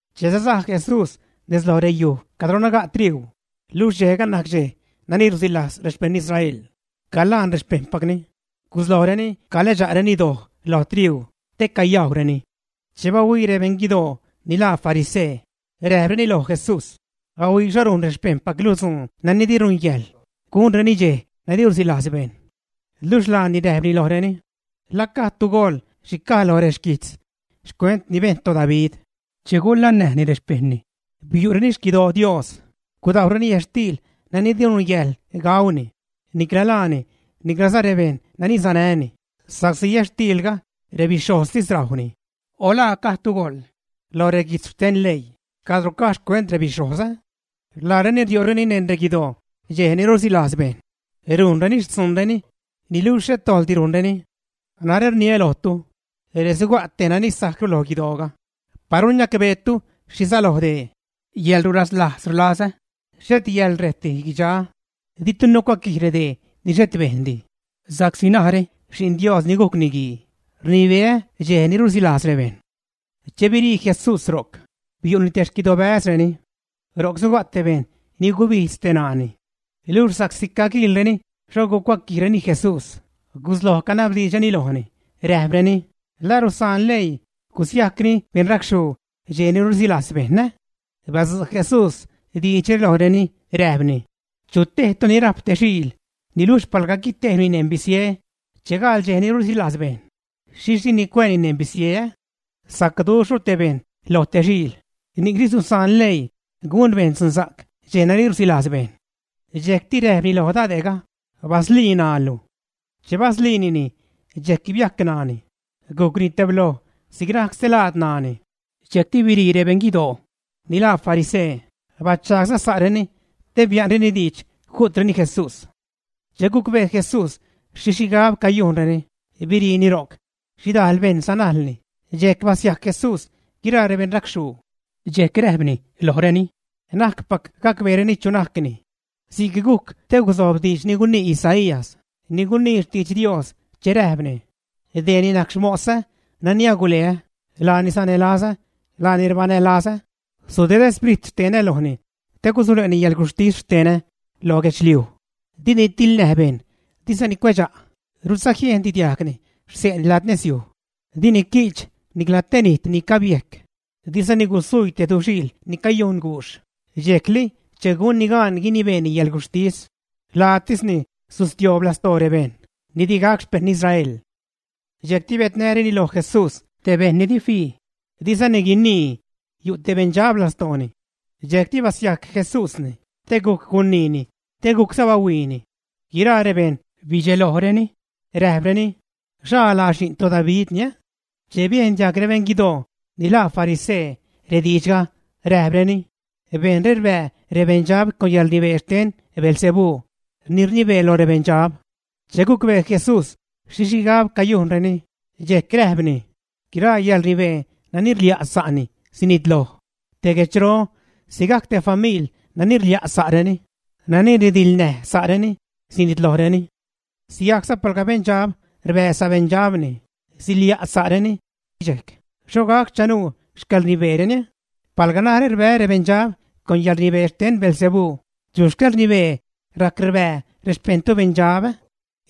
Che sasaj Jesús nez loj reyuj cadro naga' triuu, luxh dxejga najc dxej ni rusilajz rexpejṉ Israel, calaan rexpejṉpacni, guslojreni calädxa'reni doj lo triuu te cayajwrenini. Che bahuii rebeṉ guidoo ni laa farisee, räjpreni loj Jesús: ―Ahuii xho rujn rexpejṉpaclu dzuun nani di nungäjḻ gunreni dxej nani rusilajz bejṉ. Luxh laani räjpni lojreni: ―¿La gajdtu goḻ xhi caj loj reguijtz xcuent ni bejn toDavid che gulannäjni rexpejṉni, ä? Biu'reni xquidoo Dios, gudajwreni yätxtiil nani di nungäjḻ gauni, nicla laani, niclaza rebejṉ nani sanäni, sa'csi yätxtiilga rebixhojztis rajwni. O ¿la gajdtu goḻ lo reguijtz xten leii cadro caj xcuent rebixhojz, ä? Laareni riu'reni neṉ reguidoo dxej ni rusilajz bejṉ, rujnreni xtzuunreni niluxh xhet dojḻdi rujnreni. Narä rniä lojtu, ree suga' tej nani sajcru loj guidooga. Paru niacbeetu xhi säloj dee: “Yäḻrulaslajz rlazä, xhet yäḻrejtdi guidxaa”, ditu nucuaquij redee ni xhet bejndi. Sa'csi narä Xi'n Dios ni gujc Niguii rnibeä dxej ni rusilajz rebejṉ. Che birii Jesús ro'c, biu'ni te xquidobäzreni. Ro'c suga' te bejṉ ni gubijdz te ṉaani. Luxh sa'csi caguiilreni xho gucuaquijreni Jesús, gusloj canabdiidxreni lojni, räjpreni: ―¿La rusaan leii gusiajcni beṉracxhuu dxej ni rusilajz bejṉ, ä? Badzu' Jesús diidxre lojreni, räjpni: ―Chutejtu ni rajp te xiil niluxh palga guitejbni neṉ bisie che gaḻ dxej ni rusilajz bejṉ, ¿xhixh dini cuää xiilga neṉ bisie, ä? Sacduxhru te bejṉ loj te xiil, ni'cni susaan leii gun bejṉ dzunsa'c dxej nani rusilajz bejṉ. Dxejcti räjpni loj dade'ga: ―Baslii ṉaalu. Che basliinini, dxejc biajc ṉaani, gujcni tebloj si'c najc stelaad ṉaani. Dxejcti birii rebeṉ guidoo ni laa farisee, bachagsa'zareni te bia'nreni diidx ju'treni Jesús. Che gucbee Jesús xhi xhigab cayujnreni, biriini ro'c. Xhidajl bejṉ sanajlni, dxejc basiajc Jesús guiraa rebeṉracxhuu. Dxejc räjpni lojreni: ―Na'cpac gäbreni chu najcni. Si'c gujc te gusojb diidx ni gunii Isaías ni gunii xtidx Dios che räjpni: Deeni najc xmosä nani aguleä, laani sanälazä, laani rbanälazä, sudedä sprit xtenä lojni te gusule'ni yäḻguxhtis xtenä lo guedxliuj. Dini tiḻnäj bejṉ, dizani cuedxa'; rudza jiejndi diajgni xse'ni lad nezyuj. Dini qui'ch nicla te nijt ni cabiejc, dizani gusuii te duxiil ni cayujn guxh, dxejli che gunni gaan guinibeeni yäḻguxhtis. Lajtisni sustioob lastoo rebeṉ ni digac xpejṉ Israel. Dxejcti biädnäreni loj Jesús te bejṉ ni di fii, dizani guinii, yu' te beṉdxab lastooni. Dxejcti basiajc Jesúsni, te gujc guniini, te gujcza bahuiini. Guiraa rebejṉ bidxelojreni, räjpreni: ―¿Xhaa laa Xi'n toDavidni, ä? Che biejn diajg rebeṉ guidoo ni laa farisee rediidxga, räjpreni: ―Bejṉre rbää rebeṉdxab con yäḻrnibee xten Beelzebú ni rnibee loj rebeṉdxab. Che gucbee Jesús xhi xhigab cayujnreni, dxejc räjpni: ―Guiraa yäḻrnibee nani rlia' sa'ni sinitloj; te guedxro sigajc te famil nani rlia' sa'reni, nani ridiḻnäj sa'reni, sinitlojreni. Sigajcza palga beṉdxab rbää sabeṉdxabni, silia' sa'reni, dxejc ¿xho gac chanuu xcäḻrnibeereni? Palga narä rbää́ rebeṉdxab con yäḻrnibee xten Beelzebú, ¿chu xcäḻrnibee rajc rbää rexpejṉtu beṉdxab, ä?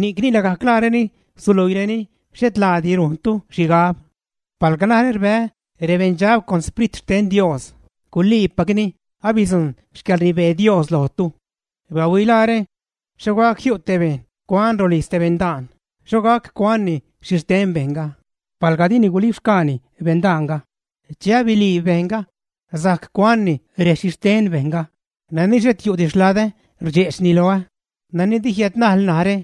Ni'cni lagajc laareni suluiireni xhet laadi rujntu xhigab. Palga narä rbää́ rebeṉdxab con Xprit xten Dios, guliipacni abidzujṉ xcäḻrnibee Dios lojtu. ’Bahuilaare. ¿Xho gac jiu' te bejṉ cuan rolijz te beṉdaan, xho gac cuanni xhixten bejṉga, palga dini gulibxgaani beṉdaanga? Che abiliib bejṉga, sajc cuanni rexhixten bejṉga. ’Nani xhet yu'di xladä, rdxe'chni loä. Nani di jiädnajl narä,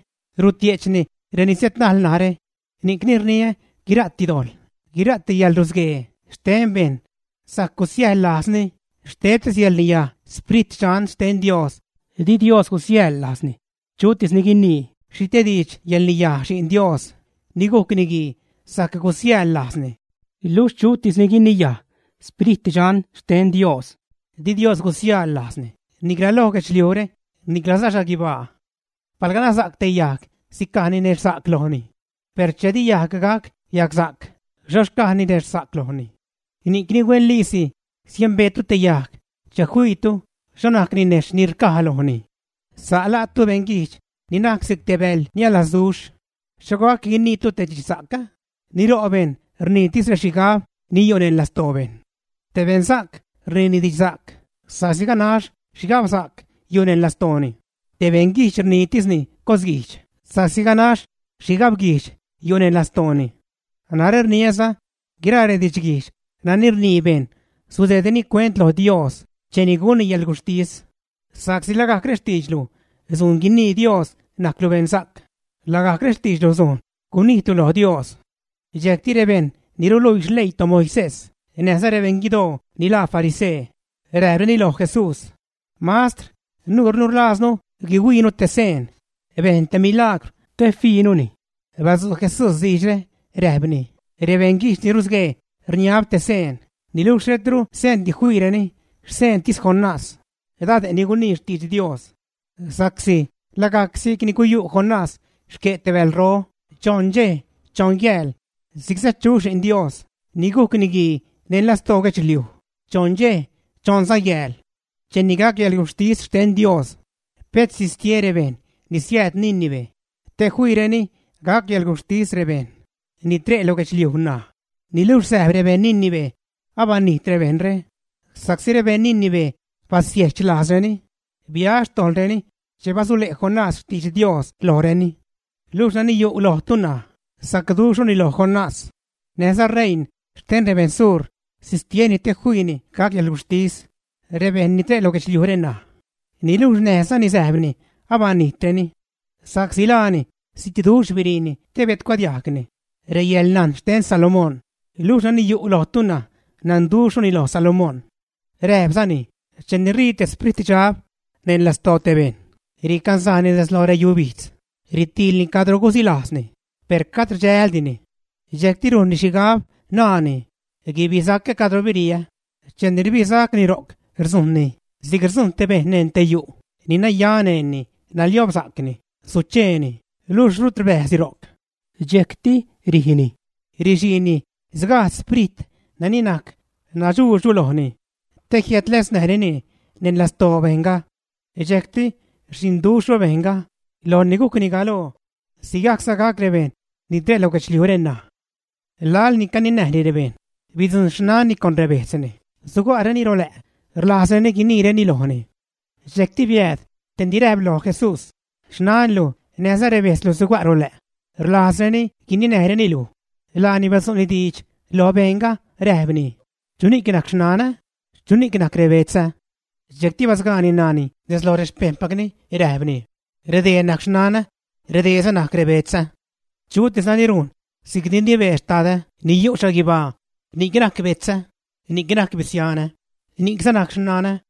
rutie'chni reni siädnajl narä. ’Ni'cni rniä guira'ti dojḻ, guira'ti yäḻrusguee xte bejṉ sajc gusiäjḻ lajzni xtebtis yäḻrniyaj Sprit Dxan xten Dios di Dios gusiäjḻ lajzni. Chutis ni guinii xhi te diidx yäḻrniyaj Xi'n Dios ni gujc Niguii sajc gusiäjḻ lajzni, luxh chutis ni guiniyaj Sprit Dxan xten Dios, di Dios gusiäjḻ lajzni, nicla lo guedxliujre, niclaza xhaguibaa. ’Palga nasa'c te yajg sicaj ninexhsa'c lojni, per che di yajg gac yagsa'c, xho xcaj ninexhsa'c lojni. Ni'cni huenliisi siembeetu te yajg che fiitu xho najc ninejxh ni rcaj lojni. Sa' la'tu beṉguijdx ni najc si'c te bäḻ niälasduxh, ¿xho gac guiniitu te didxsa'c?, ni ro' bejṉ rniitis rexhigab ni yu' neṉ lastoo bejṉ. Te beṉsa'c rniini didxsa'c, sa'csi ganax xhigabsa'c yu' neṉ lastooni, te beṉguijdx rniitisni cosguijdx sa'csi ganax xhigabguijdx yu' neṉ lastooni. Narä rniäza, guiraa redidxguijdx nani rnii bejṉ sudeedreni cuent lo Dios cheni gunni yäḻguxhtis, sa'csi lagajc rextiidxlu sujn guinii Dios najclu beṉsa'c, lagajc rextiidxlu sujn gunijtlu lo Dios. Dxejcti rebejṉ ni ruluii xleii toMoisés näjza rebeṉ guidoo ni laa farisee, räjpreni loj Jesús: ―Mastr, nuurnu rlajznu guihuiinu te seen; bejn te milagwr te fiinuni. Badzu' Jesús diidxre, räjpni: ―Rebeṉguijdx ni rusguee rniab te seen, niluxh xhetru seendi fiireni xseentis Jonás, dade' ni gunii xtidx Dios. Sa'csi lagajc si'cni guyu' Jonás xque' te bälro choṉ dxej, choṉ yääl, si'cza chu Xi'n Dios ni gujc Niguii neṉ lastoo guedxliuj choṉ dxej, choṉza yääl. Cheni gac yäḻguxhtis xten Dios pet sistie rebejṉ ni siääd Nínive te fiireni gac yäḻguxhtis rebejṉ ni tre' lo guedxliuj ṉaj, niluxh säjb rebejṉ Nínive abanijt rebejṉre sa'csi rebeṉ Nínive basiejch lajzreni, bia xtojḻreni che basule' Jonás xtidx Dios lojreni. Luxh nani yu' lojtu ṉaj, sacduxhruni loj Jonás. Näjza reiṉ xten rebeṉ sur sistieni te fiini gac yäḻguxhtis rebejṉ ni tre' lo guedxliujre ṉaj, niluxh näjzani säjbni abanijtreni. Sa'csi laani zitduxh biriini te biädcuadiajgni reyäḻnajn xten Salomón, luxh nani yu' lojtu ṉaj nanduxhruni loj Salomón. Räjpzani: ―Cheni ṟii te spritdxab neṉ lastoo te bejṉ, ricanzajni nez lo reyubijdz, ritiilni cadro gusilajzni, per cad rdxäldini. Dxejcti rujnni xhigab, naani, guibisacä cadro biriä. Cheni rbisacni ro'c, rdzujṉni si'c rdzujṉ te bejṉ neṉ te yu' ni naya neṉni, naliobsa'cni, sucheeni, luxh rut rbäjzdi ro'c. Dxejcti rijni, rixiini sgajdz sprit nani najc nadxuudxru lojni te jiädläznäjrenini neṉ lastoo bejṉga. Dxejcti rxhiṉduxhru bejṉga lojni gujcni galoo. Sigajcza gac rebejṉ ni tre' lo guedxliujre ṉaj. Laḻ ni caninäjni rebejṉ, bidzujṉ xnanni con rebejtzni, suga'reni rolä' rlajzreni guiniireni lojni. Dxejcti biääd tej ni räjp loj Jesús: ―Xnanlu näjza rebejtzlu suga' rolä' rlajzreni guininäjreni luj. Laani badzu'ni diidx lo bejṉga räjpni: ―¿Chuni'c najc xnanä? ¿Chuni'c najc rebetzä? Dxejcti basgaani ṉaani nez loj rexpejṉpacni, räjpni: ―¡Redee najc xnanä redeeza najc rebetzä! Chutis nani rujn si'cni rnibee Xtadä ni yu' xhaguibaa ni'c najc betzä, ni'c najc bisianä, ni'cza najc xnanä.